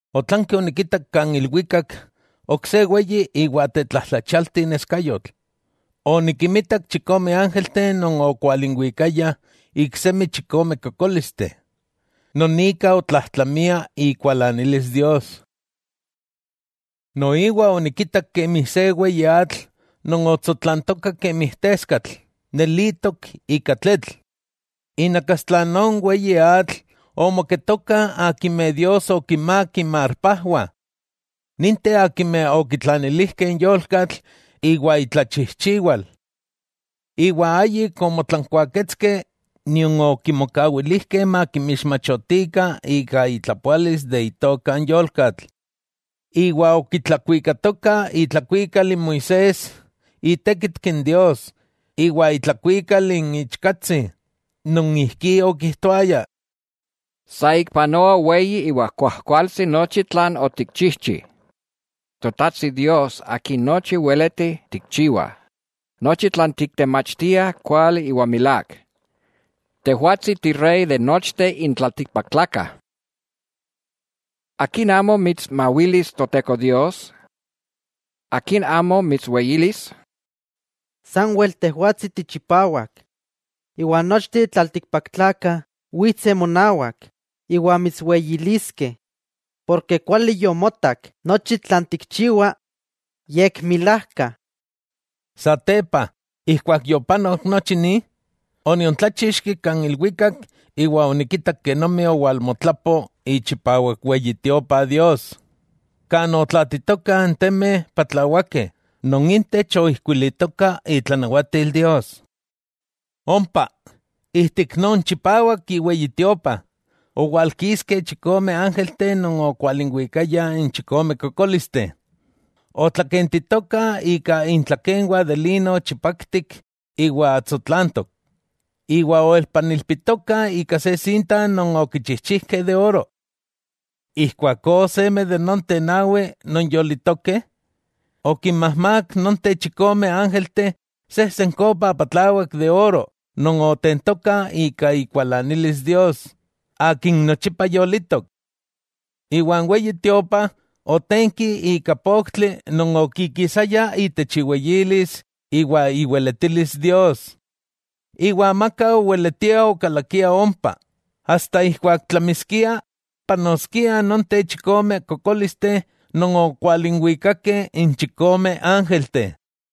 Otlanki onikitak kan ilwikak ok se weyi iwa tetlajtlachialti neskayotl: onikimitak chikome ángelteh non okwalinwikayah iksemi chikome kokólisteh, non ika otlajtlamia ikualanilis Dios. Noiwa onikitak kemi se weyi atl non otsotlantoka kemi teskatl nelitok ika tletl. Inakastla non weyi atl omoketokah akimeh Dios okinmák inmarpajwah; ninteh akimeh okitlanilijkeh n yolkatl iwa itlachijchiwal, iwa ayik omotlankuaketskeh nion okimokawilijkeh makimixmachotikah ika itlapoalis itoka n yolkatl. Iwa okitlakuikatokah itlakuikal n Moisés itékitki n Dios iwa itlakuikal n Ichkatsi, non ijkí okijtoaya: Saikpanoa weyi iwa kuajkualtsi nochi tlan otikchijchi, Totajtsi Dios Akin nochi weleti tikchiwa, nochi tlan tiktemachtia kuali iwa milák, tejwatsi Tirey de nochteh n tlaltikpaktlakah. ¿Akin amo mitsmawilis Toteko Dios? ¿Akin amo mitsweyilis? Sanwel Tejwatsi tichipawak, iwa nochteh n tlaltikpaktlakah witseh monawak iwa mitsweyiliskeh, ken kuali yomotak nochi tlan tikchiwa, yekmilajka. Satepa ijkuak yopanok nochi ni, oniontláchixki kan ilwikak iwa onikitak kenomi owalmotlapo ichipawak Weyi Tiopa Dios, kan otlatitokah n temeh patlawakeh non intech oijkuilitoka itlanawatil Dios. Ompa ijtik non chipawak iweyi Tiopa owalkiskeh chikome ángelteh non okualinwikayah n chikome kokólisteh. Otlakentitokah ika intlakenwah de lino chipaktik iwa tsotlantok, iwa oelpanilpitokah ika se sinta non okichijchijkeh ika oro. Ijkuakó seme de nonteh nawi non yolitokeh, okinmajmák nonteh chikome ángelteh sejsen kopa patlawak ika oro non otentokah ika ikualanilis Dios Akin nochipa yolitok. Iwa n Weyi Tiopa otenki ika poktli non okikisaya itech iweyilis iwa iweletilis Dios, iwa amaka oweletia okalakia ompa, asta ijkuak tlamiskiah panoskiah nonteh chikome kokólisteh non okualinwikakeh n chikome ángelteh.